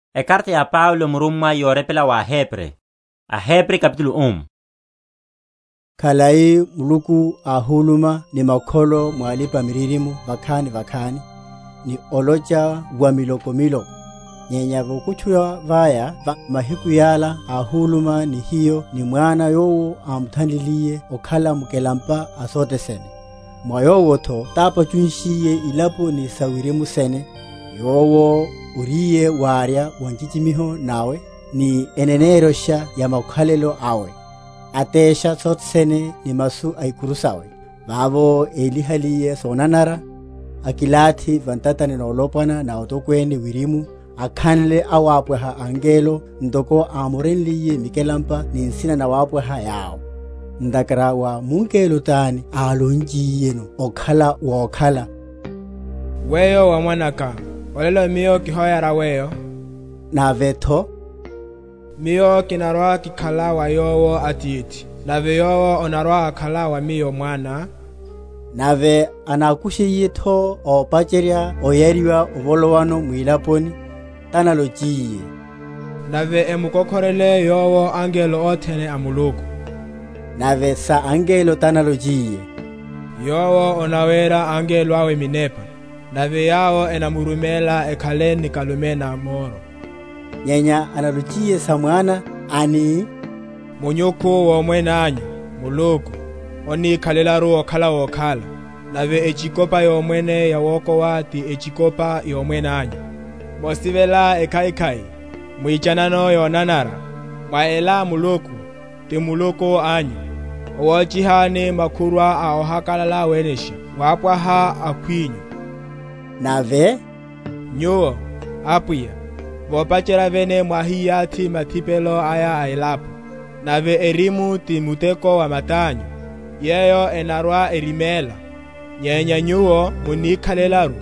Kristu, Mwana a Muluku wapwaha wawe angelo. Khalai Muluku áhuluma ni makholo mwa alipa‐miririmo vakhani vakhani, ni olocha wamiloko miloko, nyenya vokutchuwa vaya va mahiku yala áhuluma ni hiyo ni Mwana yowo ámuthanliliye okhala mukelampa a sothe sene, mwa Yowotho tápachunshiye ilapo ni sa wirimu sene; yowo, oriye warya wa nchichimiho nawe, ni eneneryosha ya makhalelo awe, atesha sothe sene ni masu a ikuru sawe, vavo élihaliye sonanara, akilathi va ntatani nolopwana na Otokwene wirimu, akhanle awapwaha angelo, ntoko ámorenliye mikelampa ni nsina nawapwaha yawo. Ntakhara wa mungelo tani álonchiyeno okhala wokhala, Weyo wa Mwanaka, Olelo Miyo kihoyara Weyo? navetho, Miyo kinarwa‐kikhala wa Yowo Atithi, Nave Yowo anarwa‐akhala wa Miyo Mwana? Nave anakushiyetho ópacherya oyariwa ovolowano mwilaponi, tanalochiye, Nave emukokhorele Yowo angelo othene a Muluku. Nave sa angelo tanalochiye, Yowo anawera angelo awe minepa, Nave yawo enamuruméla ekhale nikalume na moro; Nyenya analochiye sa Mwana, ani, Munyukhu womwene anyu, Muluku, onnikhalelaru okhala wokhala; Nave echikopa yomwene yawokowa ti echikopa yomwene anyu. Mosivela ekhaikhai, mwichanano yonanara; Mwa ela Muluku, ti Muluku anyu, ówóchihani Makhurwa a ohakalala wenesha wapwaha akhwinyu. Nave, Nyuwo, Apwiya, vopacherya vene mwáhiyathi mathipelo aya a elapo, Nave erimu ti muteko wa matányu; Yeyo enarwa‐eriméla; nyenya Nyuwo munnik?-?halelaru;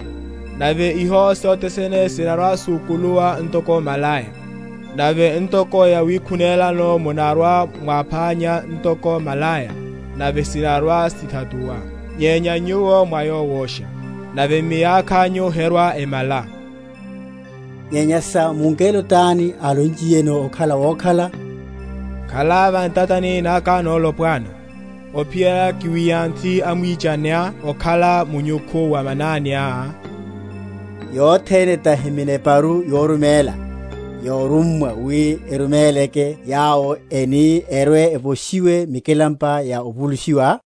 Nave iho sothe sene sinarwa‐sukuluwa ntoko malaya; Nave ntoko yawikhunelano munarwa‐mwapánya Ntoko malaya, nave sinarwa‐sithatuwa; Nyenya Nyuwo mwá Yowosha, Nave miyakhányu herwa‐emala. Nyenya sa mungelo tani álonchiyeno okhala wokhala, Khala va ntatani naka nolopwana, Ophiyerya kiwiyanthe amwichaniá okhala munyukhu wa mananiá? Yothene tahi mineparu yoruméla, yorummwa wi eruméleke yawo eni erwe‐evoshiwe mikelampa ya ovulushiwa?